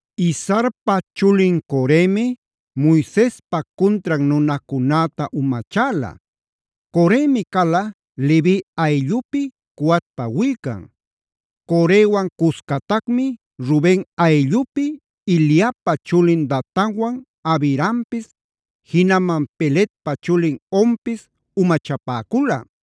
Izharpa chulin Coremi Moisespa cuntran nunacunäta umachäla. Coremi cala Levi ayllupi Coatpa willcan. Corewan cuscatacmi Ruben ayllupi Eliabpa chulin Datanwan Abirampis, jinaman Peletpa chulin Onpis umachapäcula.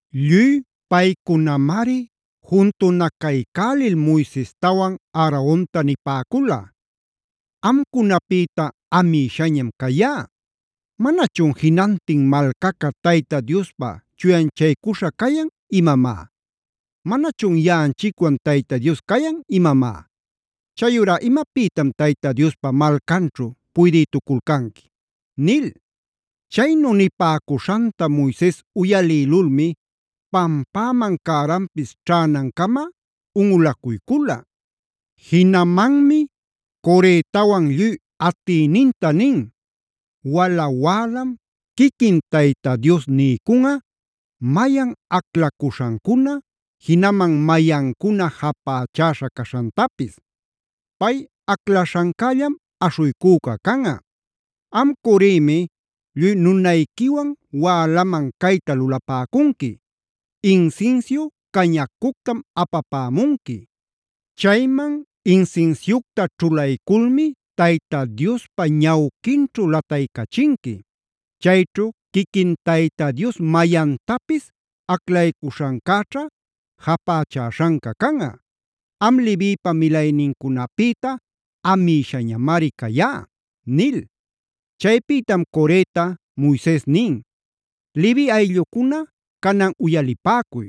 Lluy paycunamari juntunacaycälil Moisestawan Aaronta nipäcula: “¡Amcunapïta amïshañam cayá! ¿Manachun jinantin malcaca Tayta Diospa chuyanchaycuśha cayan imamá? ¿Manachun yaꞌanchicwan Tayta Dios cayan imamá? ¿Chayurá imapïtam Tayta Diospa malcanćhu puydïtuculcanqui?” nil. Chaynu nipäcuśhanta Moises uyalïlulmi pampäman cäranpis ćhänancama unꞌulacuycula. Jinamanmi Coretawan lluy atïninta nin: “Wala wälam quiquin Tayta Dios niycunꞌa mayan aclaśhancuna, jinaman mayancuna japächäśha caśhantapis. Pay aclaśhancällam aśhuycüca canꞌa. Am Coremi lluy nunayquiwan wälaman cayta lulapäcunqui: Insinsiu cañacuctam apapämunqui. Chayman insinsiucta ćhulayculmi Tayta Diospa ñawquinćhu lataycachinqui. Chayćhu quiquin Tayta Dios mayantapis aclaycuśhancäćha japächäśhanca canꞌa. Am Levipa milaynincunapïta amïshañamari cayá” nil. Chaypïtam Coreta Moises nin: “Levi ayllucuna canan uyalipäcuy.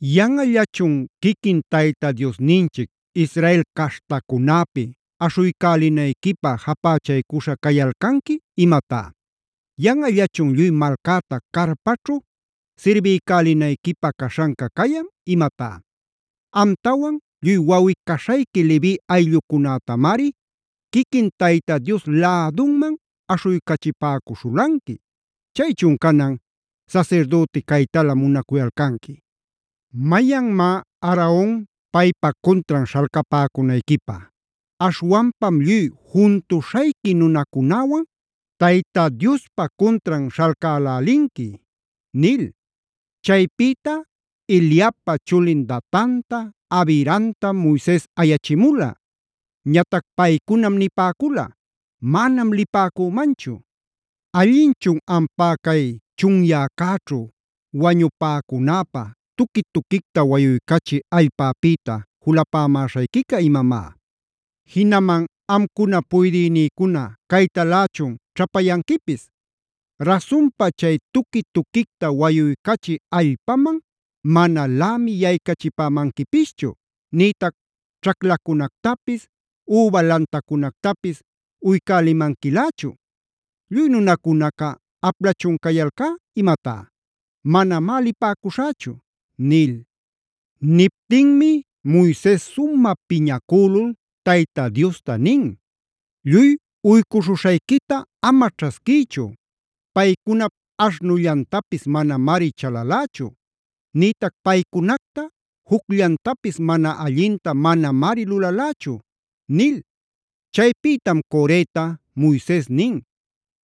¿Yanꞌallachun quiquin Tayta Diosninchic Israel caśhtacunäpi aśhuycälinayquipa japächaycuśha cayalcanqui imatá? ¿Yanꞌallachun lluy malcäta carpaćhu sirbiycälinayquipä caśhanca cayan imatá? Amtawan lluy wawꞌi-caśhayqui Levi ayllucunätamari quiquin Tayta Dios lädunman aśhuycachipäcuśhulanqui. Chaychun canan, ¿sasirdüti caytala munacuyalcanqui? ¿Mayanmá Aaron paypa cuntran śhalcapäcunayquipä? Aśhwanpam lluy juntuśhayqui nunacunäwan Tayta Diospa cuntran śhalcälälinqui” nil. Chaypïta Eliabpa chulin Datanta, Abiramtam Moises ayachimula. Ñatac paycunam nipäcula: “Manam lipäcümanchu. ¿Allinchun ampá cay chunyäcäćhu wañupäcunäpä tuqui-tuquicta wayuycachï allpapïta julapämäśhayquica imamá? ¿Jinaman amcuna puydïnïcuna caytalächun ćhapayanquipis? Rasunpa chay tuqui-tuquicta wayuycachï allpaman manalämi yaycachipämanquipischu, nïtac ćhaclacunactapis, üba lantacunactapis uycälimanquilächu. ¿Lluy nunacunaca aplachun cayalcá imatá? ¡Manamá lipäcuśhächu!” nil. Niptinmi Moises sumä piñacülul Tayta Diosta nin: “¡Lluy uycuśhuśhayquita ama ćhasquïchu! Paycunap aśhnullantapis manamari chalalächu; nïtac paycunacta jucllantapis mana allinta manamari lulalächu” nil. Chaypïtam Coreta Moises nin: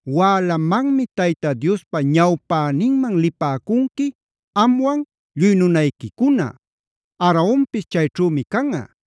“Wälamanmi Tayta Diospa ñawpäninman lipäcunqui amwan lluy nunayquicuna. Aaronpis chayćhümi canꞌa.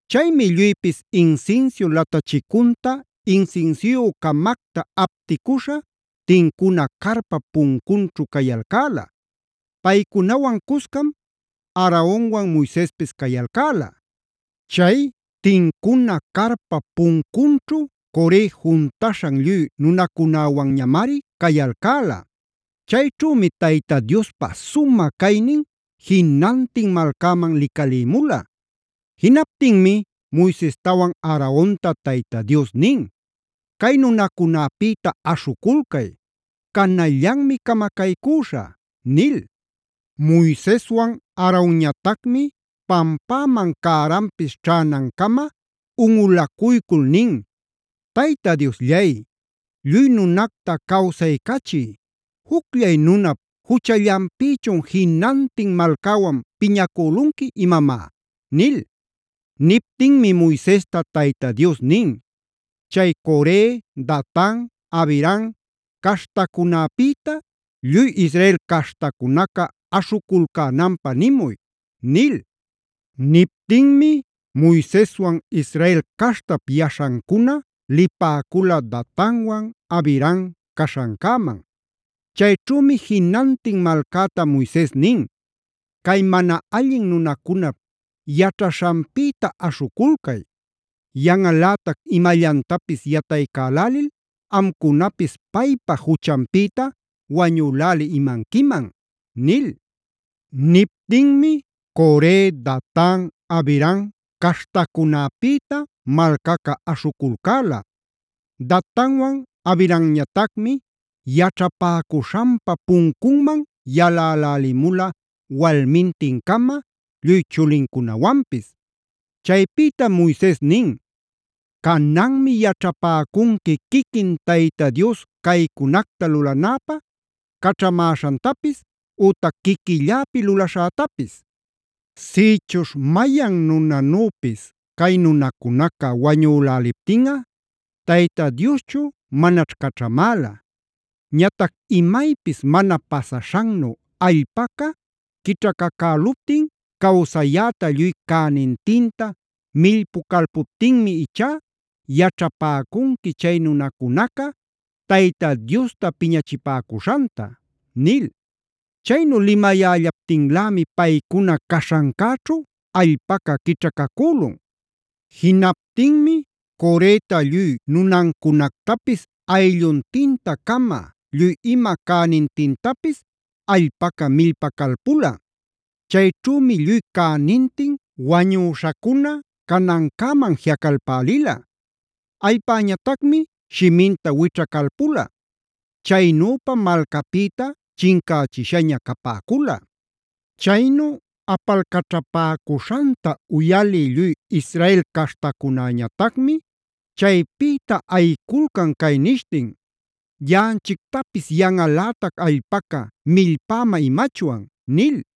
Chaymi lluypis insinsiu latachicunta insinsiuyü-camacta apticuśha tincuna carpap puncunćhu cayalcäla; paycunawan cuscam Aaronwan Moisespis cayalcäla. Chay tincuna carpap puncunćhu Core juntuśhan lluy nunacunäwanñamari cayalcäla. Chayćhümi Tayta Diospa sumä caynin jinantin malcäman licalïmula. Jinaptinmi Moisestawan Aaronta Tayta Dios nin: “Cay nunacunäpïta aśhuculcay; canallanmi camacaycüśhä” nil. Moiseswan Aronñatacmi pampäman cäranpis ćhänancama unꞌulacuycul nin: “Tayta Diosllay, lluy nunacta cawsaycachï, ¿jucllay nunap juchallanpïchun jinantin malcäwan piñacülunqui imamá?” nil. Niptinmi Moisesta Tayta Dios nin: “Chay Core, Datan, Abiram caśhancunäpïta lluy Israel caśhtacunaca aśhuculcänanpä nimuy” nil. Niptinmi Moiseswan Israel caśhtap yaśhancuna lipäcula Datanwan Abiram caśhancäman. Chayćhümi jinantin malcäta Moises nin: “Cay mana allin nunacunap yaćhaśhanpïta aśhuculcay. Yanꞌalätac imallantapis yataycälälil amcunapis paypa juchanpïta wañüläli imanquiman” nil. Niptinmi Core, Datan, Abiram caśhancunäpïta malcaca aśhuculcäla. Datanwan Abiramñatacmi yaćhapäcuśhanpa puncunman yalälälimula walmintin-cama, lluy chulincunawanpis. Chaypïtam Moises nin: “Cananmi yaćhapäcunqui quiquin Tayta Dios caycunacta lulänäpä caćhamäśhantapis ütac quiquilläpi luläśhätapis. Sïchuśh mayan nunanüpis cay nunacunaca wañüläliptinꞌa Tayta Dioschu manaćh caćhamäla. Ñatac imaypis mana pasaśhannu allpaca quićhacacäluptin, cawsayäta lluy cänintinta millpucalpuptinmi ichá yaćhapäcunqui chay nunacunaca Tayta Diosta piñachipäcuśhanta” nil. Chaynu limayällaptinlämi paycuna caśhancäćhu allpaca quićhacacülun. Jinaptinmi Coreta lluy nunancunactapis aylluntinta-cama, lluy ima cänintintapis allpaca millpacalpula. Chayćhümi lluy cänintin wañüśhacuna canancäman jiꞌacalpälila. Allpäñatacmi shiminta wićhacalpula. Chaynüpam malcapïta chincächishaña capäcula. Chaynu apalcaćhapäcuśhanta uyalï lluy Israel caśhtacunäñatacmi chaypïta ayiculcan cay nishtin: “Yaꞌanchictapis yanꞌalätac allpaca millpäma imachwan” nil.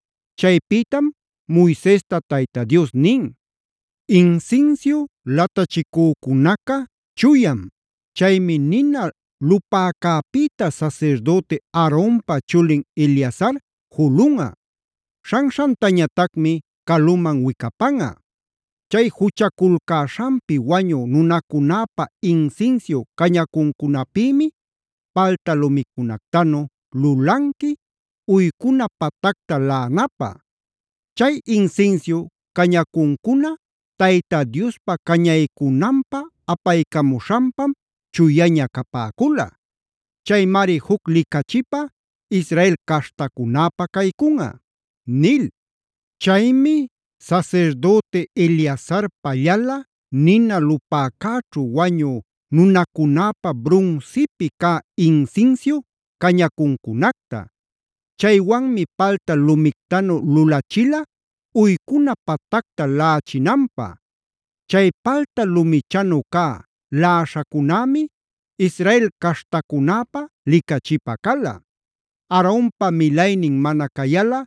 Chaypïtam Moisesta Tayta Dios nin: “Insinsiu latachicücunaca chuyam. Chaymi nina lupäcäpïta sasirdüti Aaronpa chulin Eleazar julunꞌa; śhanśhantañatacmi caluman wicapanꞌa. Chay juchaculcäśhanpi wañü nunacunäpa insinsiu cañacuncunapïmi palta lumicunactanu lulanqui, uycuna patacta laꞌanapä. Chay insinsiu cañacuncuna Tayta Diospä cañaycunanpä apaycamuśhanpam chuyaña capäcula. Caymari juc licachipä Israel caśhtacunäpä caycunꞌa” nil. Chaymi sasirdüti Eleazar pallala, nina lupäcäćhu wañü nunacunäpä brunsipi cä insinsiu cañacuncunacta. Chaywanmi palta lumictanu lulachila uycuna patacta laꞌachinanpä. Chay palta lumichanu cä laꞌaśhacunämi Israel caśhtacunäpä licachipä cala; Aaronpa milaynin mana cayalꞌa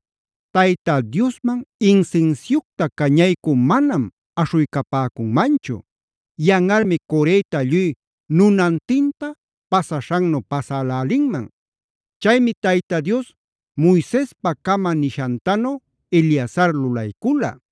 Tayta Diosman insinsiucta cañaycü manam aśhuycapäcunmanchu. Yanꞌalmi Coreta lluy nunantinta pasaśhannu pasälälinman. Chaymi Tayta Dios Moisespacama nishantanu Eleazar lulaycula.